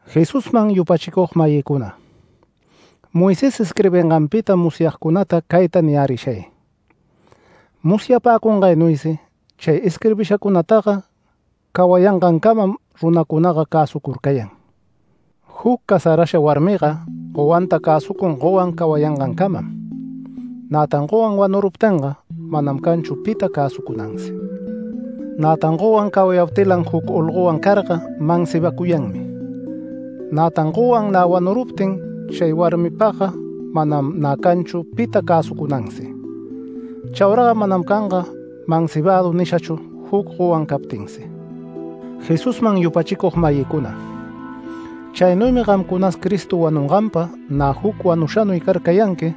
Jesusman yupachicug-mayïcuna, Moisés isquirbinganpita musyagcunata cayta niyärishay: Musyapäcungaynuysi chay isquirbishacunataga cawayangancamam runacunaga cäsucurcayan. Juc casarasha warmiga gowanta cäsucun gowan cawayangancamam. Nätan gowan wanuruptinga manam canchu pita cäsucunansi. Nätan gowan cawayaptilan juc olgowan carga mansibacuyanmi. Nätan gowan nä wanuruptin chay warmipagga manam nä canchu pita cäsucunansi. Chauraga manam canga ‘mansibadu’ nishachu juc gowan captinsi. Jesusman yupachicug-mayïcuna, chaynuymi gamcunas Cristo wanunganpa nä juc wanushanuy carcayanqui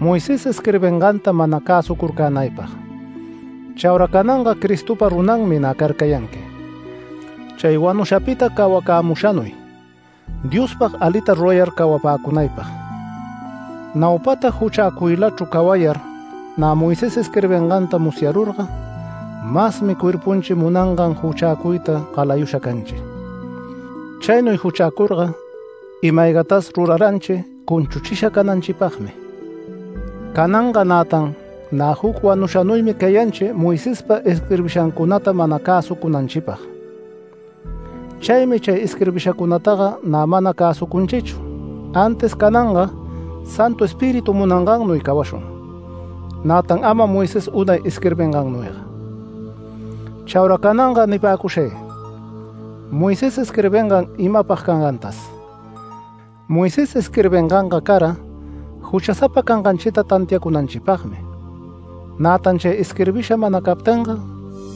Moisés isquirbinganta mana cäsucurcänaypag. Chaura cananga Cristopa runanmi nä carcayanqui, chay wanushapita cawacämushanuy, Diospag alita rurayar cawapäcunaypag. Naupata juchäcuylachru cawayar nä Moisés isquirbinganta musyarurga masmi cuerpunchi munangan juchäcuyta galayusha canchi. Chaynuy juchäcurga ima-aygatas ruraranchi cunchuchisha cananchipagmi. Cananga nätan nä juc wanushanuymi cayanchi Moisespa isquirbishancunata mana cäsucunanchipag. Chaymi chay isquirbishancunataga nä mana cäsucunchichu, antis cananga Santu Espíritu munangannuy cawashun; nätan ama Moisés unay isquirbingannuyga. Chaura cananga nipäcushay: Moisés isquirbingan imapag cangantas. Moisés isquirbinganga cara juchasapa canganchita tantiacunanchipagmi. Nätan chay isquirbisha mana captinga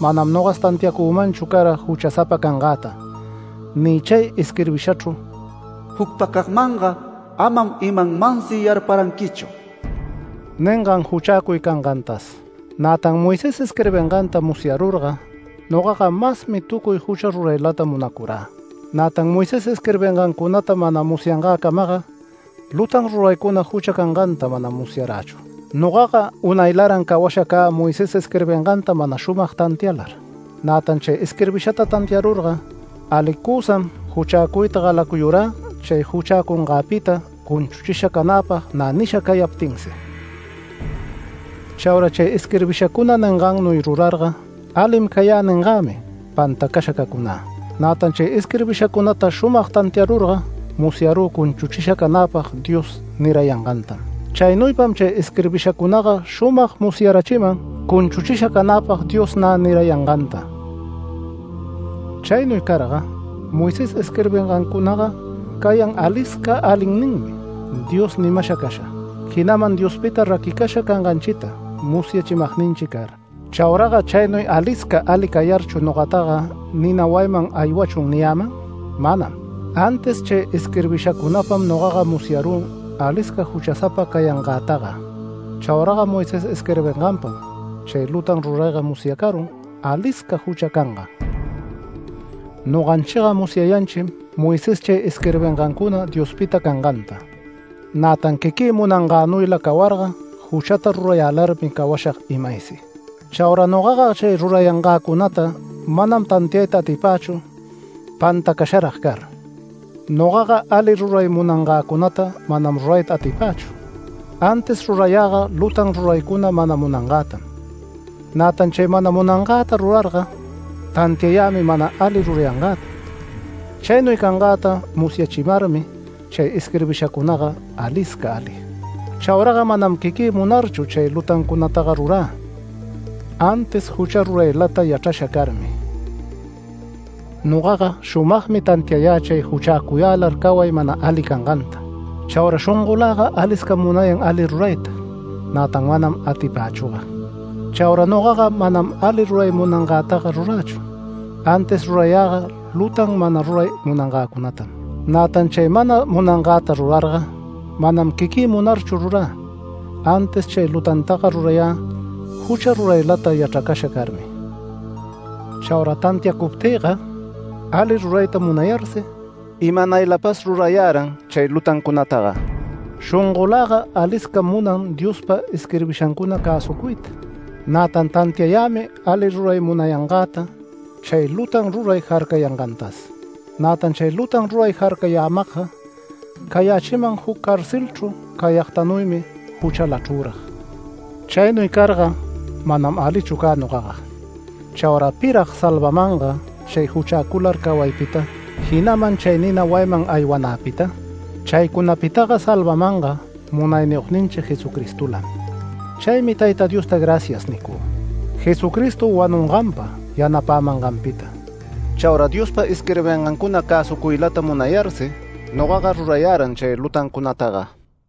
manam nogas tantiacümanchu cara juchasapa cangäta ni chay isquirbishachru “Jucpacagmanga amam imanmansi yarparanquichu” ningan juchäcuy cangantas. Nätan Moisés isquirbinganta musyarurga, nogaga masmi tucuy jucha ruraylata munacurä. Nätan Moisés isquirbingancunata mana musyangäcamaga lutan ruraycuna jucha canganta manam musyarächu. Nogaga unaylaran cawasha cä Moisés isquirbinganta mana shumag tantialar. Nätan chay isquirbishata tantiarurga alicusam juchäcuyta galacuyurä chay juchäcungäpita cunchuchisha canäpag nä nisha cayaptinsi. Chaura chay isquirbishacuna ningannuy rurarga “Alim cayä” ningämi pantacasha cacunä. Nätan chay isquirbishacunata shumag tantiarurga musyarü cunchuchisha canäpag Dios nirayangantam. Chaynuypam chay isquirbishacunaga shumag musyarachiman cunchuchisha canäpag Dios nä nirayanganta. Chaynuy carga Moisés isquirbingancunaga cayan alisca alinninmi Dios nimasha casha, jinaman Diospita raquicasha canganchita musyachimagninchi car. Chauraga chaynuy alisca ali cayarchu nogataga ¿“Nina wayinman aywachun” niyäman? Manam. Antis chay isquirbishacunapam nogaga musyararü alisca juchasapa cayangätaga. Chauraga Moisés isquirbinganpam chay lutan rurayga musyacarun alisca jucha cangan. Noganchiga musyayanchim Moisés chay isquirbingancuna Diospita canganta. Nätan quiquï munangänuyla cawarga juchata rurayälarmi cawashag imaysi. Chaura nogaga chay rurayangäcunata manam tantiayta atipächu pantacasharag car. Nogaga ali ruray munangäcunata manam rurayta atipächu. Antis rurayäga lutan ruraycuna mana munangätam. Nätan chay mana munangäta rurarga tantiämi mana ali rurayangäta. Chaynuy cangäta musyachimarmi chay isquirbishacunaga alisca ali. Chauraga manam quiquï munarchu chay lutancunataga rurä, antis jucha ruraylata yachrasha carmi. Nogaga shumagmi tantiayä chay juchäcuyälar caway mana ali canganta. Chaura shongölaga aliscam munayan ali rurayta; nätan manam atipächüga. Chaura nogaga manam ali ruray munangätaga rurächu, antis rurayäga lutan mana ruray munangäcunatam. Nätan chay mana munangäta rurarga, manam quiquï munarchu rurä, antis chay lutantaga rurayä jucha ruraylata yachracasha carmi. Chaura tantiacuptïga ali rurayta munayarsi, imanaylapas rurayäran chay lutancunataga. Shongoläga aliscam munan Diospa isquirbishancuna cäsucuyta. Nätan tantiayämi ali ruray munayangäta chay lutan ruray jarcayangantas. Nätan chay lutan ruray jarcayamagga cayächiman juc carcelchru cayagtanuymi juchalachrürag. Chaynuy carga manam alichu cä nogaga. ¿Chaura pirag salvamanga chay juchäcular cawaypita, jinaman chay nina wayiman aywanäpita? Chaycunapitaga salvamanga Munayniyogninchi Jesucristolam. Chaymi Tayta Diosta “Gracias” nicü, Jesucristo wanunganpa yanapämanganpita. Chaura Diospa isquirbingancuna cäsucuylata munayarsi nogaga rurayäran chay lutancunataga.